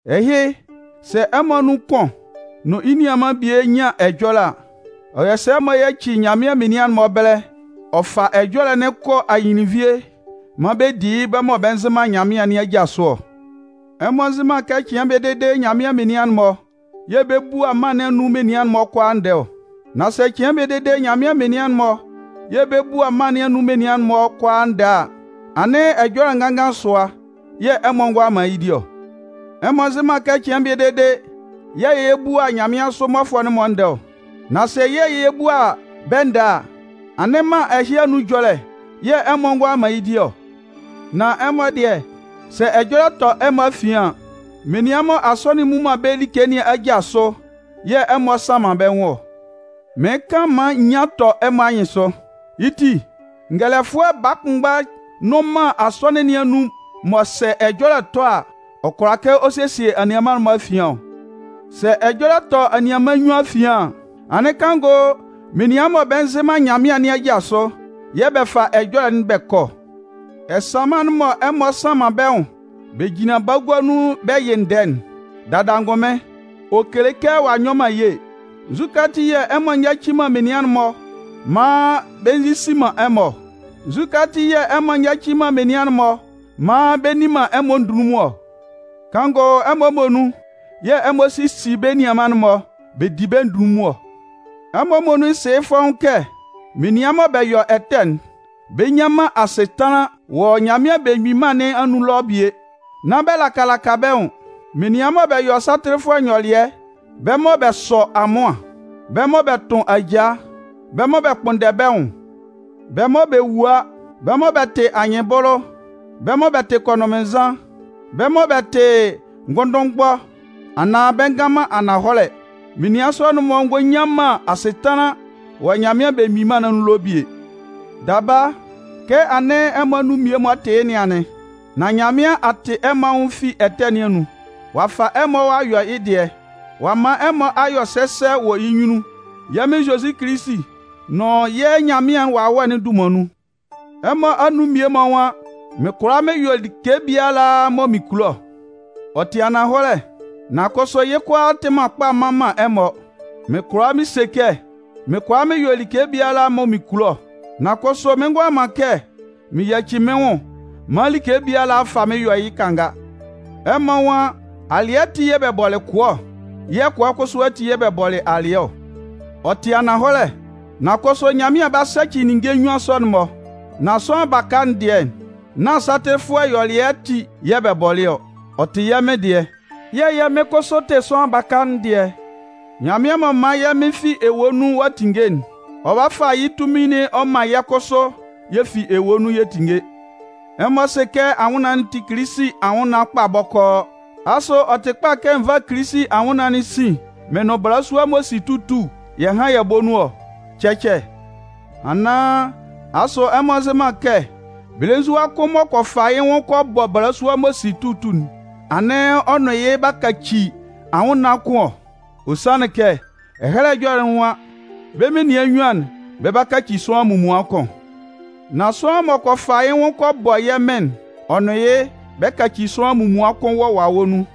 Ɛhɩ, sɛ ɛmɔ anun kʋn nʋn yɩ́ nianman bie nyan ɛjɔlɛ a, ɔ yɔ sɛ m'ɔ yaci Nyanmɩan menian'n-mɔ ɛbɛlɛ ɔ fa ɛjɔlɛ'n kɔ ahɩnlɩnnvie maan bɛ di yɩ́ bɛ́ mɔ bɛ nzɩ man Nyanmɩan nɩn aja sʋ ɔ? Ɛmɔ nzɩ man kɛ cɩan bie dede Nyanmɩan menian'n-mɔ yɛ̂ bɛ 'bua mân nɩn anun menian'n-mɔ kʋalaa ndɛɛ ɔ? Nán sɛ cɩan bie dede Nyanmɩan menian'n-mɔ yɛ̂ bɛ 'bua mân nɩn anun menian'n-mɔ kʋalaa ndɛɛ a, anɩn ɛjɔlɛ nganngan sʋa yɛ̂ ɛmɔ ngʋala man yɩ́ di ɔ? Ɛmɔ nzɩ man kɛ cɩan bie dede, yɛ́ yɛ̂ yɛ 'bua nyanmɩansʋ mmɔfʋɛ'n-mɔ ndɛɛ ɔ? Nán sɛ yɛ́ yɛ̂ yɛ 'bua bɛ́ ndɛɛ a, anɩn mân ɛhɩ anun ɛjɔlɛ yɛ̂ ɛmɔ ngʋala man yɩ́ di ɔ? Nan ɛmɔ dɩɛ, sɛ ɛjɔlɛ tɔ ɛmɔ afian an, menian mɔ Asɔnɩn'n mmu man bɛ́ like nɩn aja sʋ yɛ̂ ɛmɔ sanman bɛ́ nwʋn ɔ. Mɩɩn kan maan nyian tɔ ɛmɔ anyɩnsʋ. Yɩ́ ti, ngɛlɛfʋɛ baa kʋnmgba nnʋn man Asɔnɩn nɩn anun mɔ sɛ ɛjɔlɛ tɔ a, ɔ kʋala kɛ ɔ sesie anianman'n-mɔ afian ɔ? Sɛ ɛjɔlɛ tɔ anianman nnyuan afian an, anɩn kanngʋ menian mɔ bɛ nzɩ man Nyanmɩan nɩn aja sʋ yɛ̂ bɛ fa ɛjɔlɛ'n bɛ kɔ ɔ? Ɛsanman'n mɔ ɛmɔ sanman bɛ́ nwʋn bɛ jinlan bagua nun bɛ yɩ ndɛɛ'n, dada angʋnmɩn, ɔ kele kɛ ɔ'a nyɔ man ye. Nzukɛ ati yɛ̂ ɛmɔ nyaci man menian'n-mɔ maan bɛ nzisi man ɛmɔ ɔ? Nzukɛ ati yɛ̂ ɛmɔ nyaci man menian'n-mɔ maan bɛ nni man ɛmɔ ndunlunmun ɔ? Kanngʋ ɛmɔ muonun yɛ̂ ɛmɔ sisi bɛ́ nianman'n-mɔ bɛ di bɛ́ ndunlunmun ɔ. Ɛmɔ muonun sɩ yɩ́ fɔ́ʋ́n kɛ menian mɔ bɛ yɔ ɛtɛ'n, bɛ nnyan man asɩtanlan wɔ Nyanmɩan Belemgbin Mân nɩn anun ɛlɔ bie. Nán bɛ laka laka bɛ́ nwʋn. Menian mɔ bɛ yɔ satɩlɩfʋɛ nyɔlɩɛ, bɛ́ mɔ bɛ sɔ amʋan, bɛ́ mɔ bɛ tʋn ajaa, bɛ́ mɔ bɛ kpʋnndɛ bɛ́ nwʋn, bɛ́ mɔ bɛ wua, bɛ́ mɔ bɛ tɩ anyɩnbʋlʋ, bɛ́ mɔ bɛ tɩ kɔnʋnmɩnnzan, bɛ́ mɔ bɛ tɩ ngʋnndʋnmgbɔ anaan bɛ ngan man ananhɔlɛ, menian sɔ'n-mɔ ngɔ nnyan man asɩtanlan wɔ Nyanmɩan Belemgbin Mân nɩn anun ɛlɔ bie. Daba, kɛ anɩn ɛmɔ anun mmie-mɔ tɩ yɩ́ nɩn anɩn. Nan Nyanmɩan a tɩ ɛmɔ anwʋn fi ɛtɛ nɩn anun, ɔ'a fa ɛmɔ ɔ'a yɔ yɩ́ dɩɛ, ɔ'a man ɛmɔ a yɔ sɛsɛ wɔ yɩ́ nyunnun yɛ́ Mɩn Zozi Kilisi nʋn yɛ́ Nyanmɩan Wawɛ'n dunman nun. Ɛmɔ anun mmie-mɔ nwan: “Mɩn kʋala mɩn yɔ like biala mɔ mɩn kulo ɔ.” Ɔ tɩ ananhɔlɛ, nan kʋsʋ yɩ́ kʋalaa tɩ man kpa mman man ɛmɔ. Mɩn kʋala mɩn se kɛ: “Mɩn kʋala mɩn yɔ like biala mɔ mɩn kulo ɔ”, nan kʋsʋ mɩn ngʋala man kɛ mɩn yaci mɩ́n nwʋn maan like biala fa mɩ́n yɔ yɩ́ kanga. Ɛmɔ nwan: “Alɩɛ ati yɛ̂ bɛ bɔlɩ kʋɛ ɔ, yɛ̂ kʋɛ kʋsʋ ati yɛ̂ bɛ bɔlɩ alɩɛ ɔ.” Ɔ tɩ ananhɔlɛ, nan kʋsʋ Nyanmɩan 'ba sɛcɩ ninnge nnyuan sɔ'n-mɔ. Nan sʋanlan baka'n dɩɛ, nán satɩlɩfʋɛ ɛyɔlɛ ati yɛ̂ bɛ bɔlɩ ɔ. Ɔ tɩ yɛ́ Mɩn dɩɛ, yɛ̂ yɛ́ Mɩn kʋsʋ tɩ sʋanlan baka'n dɩɛ. Nyanmɩan m'ɔ man yɛ́ Mɩn fi ewue nun a tinnge'n, ɔ 'ba fa yɩ́ tunmin'n ɔ man yɛ́ kʋsʋ yɛ fi ewue nun yɛ tinnge. Ɛmɔ sɩ kɛ ɛmɔ anwʋnnaan'n tɩ Kilisi anwʋnnaan kpa bɔkɔɔ. Asʋ ɔ tɩ kpa kɛ n vá Kilisi anwʋnnaan'n sin mɩn nʋn balasua m'ɔ si tutu'n yɛ hán yɛ bɔ́ nun ɔ? Cɛcɛ! Anaan, asʋ ɛmɔ nzɩ man kɛ belenzua kʋn m'ɔ kɔ fa yɩ́ nwʋn kɔ bɔ balasua m'ɔ si tutu'n, anɩn ɔ nʋn yɩ́ b'a kaci anwʋnnaan kʋn ɔ? Ɔ sanlɩn kɛ, Ɛhɛlɛ Ɛjɔlɛ'n nwan: Bɛ́ menian nnyuan'n, bɛ 'ba kaci sʋanlan munmuan kʋn. Nan sʋanlan m'ɔ kɔ fa yɩ́ nwʋn kɔ bɔ yɛ́ Mɩn'n, ɔ nʋn yɩ́ bɛ kaci sʋanlan munmuan kʋn wɔ wawɛ nun.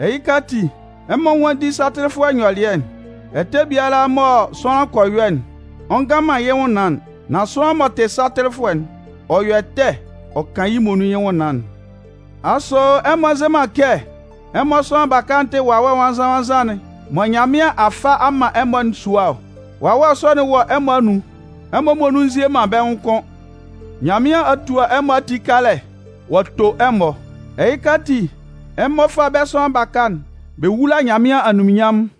Ɛhɩka ati, ɛmɔ nwánndi satɩlɩfʋɛ ɛyɔlɛ'n. Ɛtɛ biala mɔ sʋanlan kɔ yɔ'n, ɔ ngan man yɩ́ nwʋnnaan'n. Nan sʋanlan m'ɔ tɩ satɩlɩfʋɛ'n, ɔ yɔ ɛtɛ ɔ kan yɩ́ muonun yɩ́ nwʋnnaan'n. Asʋ ɛmɔ nzɩ man kɛ ɛmɔ sʋanlan baka'n tɩ Wawɛ Nwannzan-nwannzan'n mɔ Nyanmɩan a fa a man ɛmɔ'n sua ɔ? Wawɛ sɔ'n wɔ ɛmɔ anun. Ɛmɔ muonun nzie man bɛ́ nwʋn kʋ́n. Nyanmɩan a tua ɛmɔ ati kalɛ ɔ'a to ɛmɔ. Ɛhɩka ati, ɛmɔ fá bɛ́ sʋanlan baka'n bɛ wúla Nyanmɩan anunminnyanmʋn.